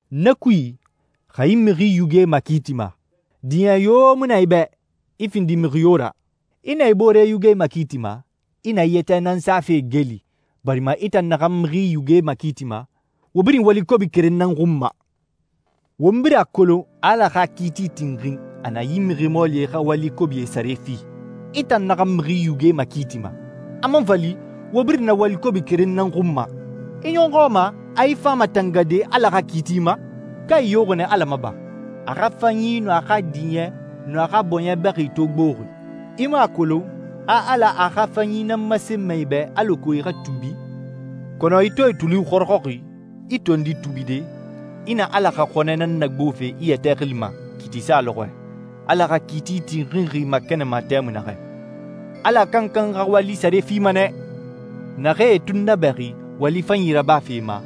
Na kui, xa i mixi yuge makiitima, diɲɛ yo mu na i bɛ, i findi mixi yo ra. I nɛ i boore yuge makiitima, i na i yɛtɛ nan safe geeli, barima i tan naxan mixi yuge makiitima, wo birin wali kobi keren nan xun ma. Won birin a kolon a Ala xa kiiti tinxin a na yi mixi mɔɔlie xa wali kobie sare fi. I tan naxan mixi yuge makiitima, a man fa li wo birin na wali kobi keren nan xun ma, i ɲɔxɔ a ma a i fama tangade Ala xa kiiti ma? Ka i yoxi nɛ Ala ma ba, a xa fanyi nun a xa diɲɛ nun a xa bɔɲɛ bɛxi to gboxi? I mu a kolon a Ala a xa fanyi nan masenma i bɛ alako i xa tuubi? Kɔnɔ i to i tuli xɔrɔxɔxi, i tondi tuubide, i na Ala xa xɔnɛ nan nagbofe i yɛtɛ xili ma kiiti sa lɔxɔɛ, Ala xa kiiti tinxinxi makɛnɛnma tɛmui naxɛ. Ala kankan xa wali sare fima nɛ. Naxee e tunnabɛxi wali fanyi rabafe ma,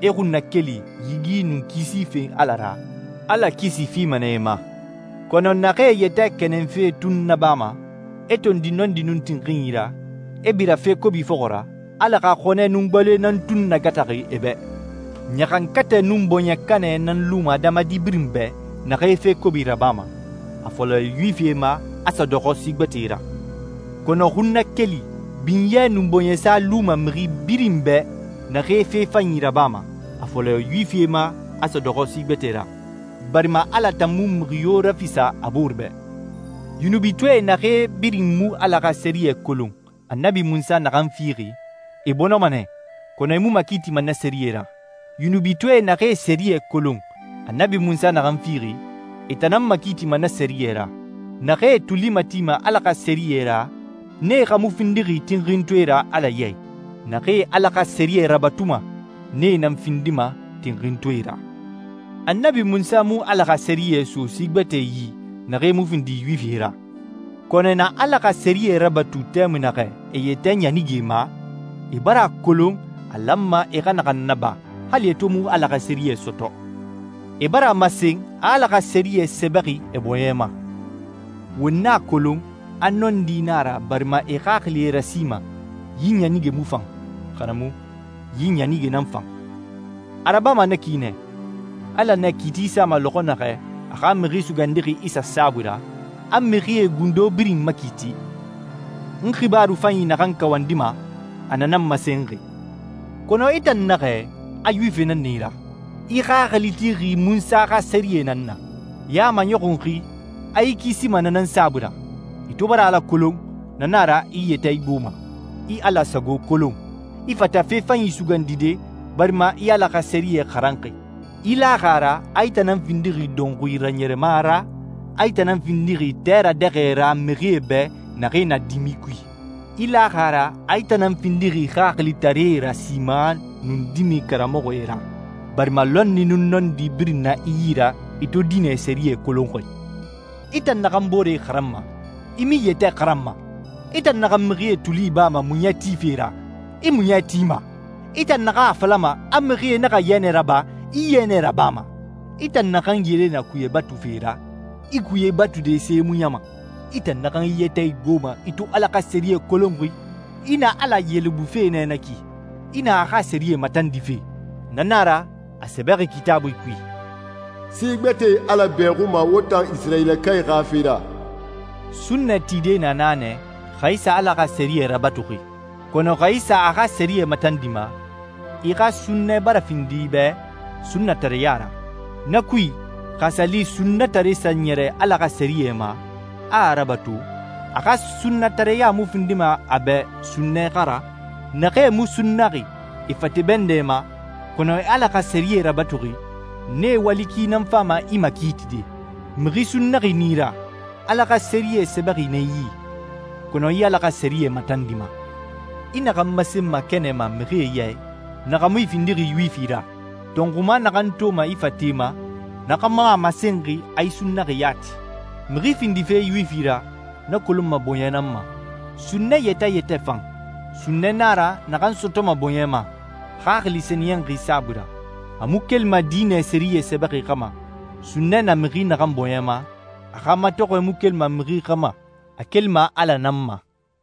e xunnakeli, yigi, nun kisi fen Ala ra, Ala kisi fima nɛ e ma. Kɔnɔ naxee e yɛtɛ kɛnɛnfe tun nabama, e tondi nɔndi nun tinxinyi ra, e bira fe kobi fɔxɔ ra, Ala xa xɔnɛ nun gbaloe nan tun nagataxi e bɛ. Ɲaxankatɛ nun bɔɲɛkanɛ nan luma adamadi birin bɛ naxee fe kobi rabama, a fɔlɔ Yuwifie ma, a sa dɔxɔ si gbɛtɛe ra. Kɔnɔ xunnakeli, binyɛ, nun bɔɲɛsa luma mixi birin bɛ naxee fe fanyi rabama, a fɔlɔ Yuwifie ma, a sa dɔxɔ si gbɛtɛe ra, barima Ala tan mu mixi yo rafisa a boore bɛ. Yunubitɔɛe naxee birin mu Ala xa sɛriyɛ kolon Annabi Munsa naxan fixi, e bɔnɔma nɛ, kɔnɔ e mu makiitima na sɛriyɛ ra. Yunubitɔɛe naxee sɛriyɛ kolon Annabi Munsa naxan fixi, e tan nan makiitima na sɛriyɛ ra. Naxee e tuli matima Ala xa sɛriyɛ ra, nee xa mu findixi tinxintɔɛe ra Ala ya i. Naxee Ala xa sɛriyɛ rabatuma, nee nan findima tinxintɔɛe ra. Annabi Munsa mu Ala xa sɛriyɛ so si gbɛtɛe yi, naxee mu findi Yuwifie ra. Kɔnɔ e na Ala xa sɛriyɛ rabatu tɛmui naxɛ e yɛtɛ ɲanige ma, e bara a kolon a lanma e xa naxan naba, hali e to mu Ala xa sɛriyɛ sɔtɔ. E bara a masen a Ala xa sɛriyɛ sɛbɛxi e bɔɲɛ ma. Won a kolon a nɔndi na a ra barima e xaxili e rasima, «Yi ɲanige mu fan,» xa na mu, «Yi ɲanige nan fan.» A rabama na ki nɛ, Ala nɛ kiiti sama lɔxɔ naxɛ a xa Mixi Sugandixi Isa saabui ra, a mixie gundo birin makiiti. N xibaaru fanyi naxan kawandima, a na nan masenxi. Kɔnɔ i tan naxɛ a Yuwifi nan na i ra. I xaxili tixi Munsa xa Sɛriyɛ nan na. I a maɲɔxunxi a i kisima na nan saabui ra. I to bara Ala kolon, na na a ra i i yɛtɛ igboma. I Ala sago kolon. I fata fe fanyi sugandide barima i Ala xa sɛriyɛ xaranxi. I laxi a ra a i tan nan findixi dɔnxuie raɲɛrɛma ra, a i tan nan findixi tɛ radɛxɛ ra mixie bɛ naxee na dimi kui. I laxi a ra a i tan nan findixi xaxilitaree rasima nun dimɛe karamɔxɔe ra, barima lɔnni nun nɔndi birin na i yi ra i to diinɛ sɛriyɛ kolonxi. I tan naxan boore xaranma, i mu i yɛtɛ xaranma! I tan naxan mixie tuli ibama muɲɛ tife ra, i muɲɛ tima! I tan naxan a falama a mixie naxa yɛnɛ raba, i yɛnɛ rabama! I tan naxan yele na kuye batufe ra, i kuye batude see muɲama! I tan naxan i yɛtɛ igboma i to Ala xa sɛriyɛ kolonxi, i na Ala yelebufe nɛ na ki, i na a xa sɛriyɛ matandife! Na na a ra, a sɛbɛxi Kitaabui kui, «Si gbɛtɛe Ala bɛxuma wo tan Isirayilakae xa fe ra.» Sunnɛ tide na na nɛ xa i sa Ala xa sɛriyɛ rabatuxi. Kɔnɔ xa i sa a xa sɛriyɛ matandima, i xa sunnɛ bara findi i bɛ sunnatareya ra. Na kui, xa a sa li sunnatare sa ɲɛrɛ Ala xa sɛriyɛ ma, a a rabatu, a xa sunnatareya mu findima a bɛ sunnɛ xa ra? Naxee mu sunnaxi e fate bɛndɛ ma, kɔnɔ e Ala xa sɛriyɛ rabatuxi, nee wali ki nan fama i makiitide. Mixi sunnaxi nan i ra, Ala xa sɛriyɛ sɛbɛxi na i yi, kɔnɔ i Ala xa sɛriyɛ matandima. I naxan masenma kɛnɛ ma mixie ya i, na xa mu i findixi Yuwifi ra. Tɔnxuma naxan toma i fate ma, na xa mu a masenxi a i sunnaxi yati. Mixi findife Yuwifi ra, na kolonma bɔɲɛ nan ma. Sunnɛ yɛtɛ yɛtɛ fan, sunnɛ na a ra naxan sɔtɔma bɔɲɛ ma, Xaxili Sɛniyɛnxi saabui ra. A mu kelima diinɛ sɛriyɛ sɛbɛxi xa ma. Sunnɛ na mixi naxan bɔɲɛ ma, a xa matɔxɔɛ mu kelima mixi xa ma, a kelima Ala nan ma.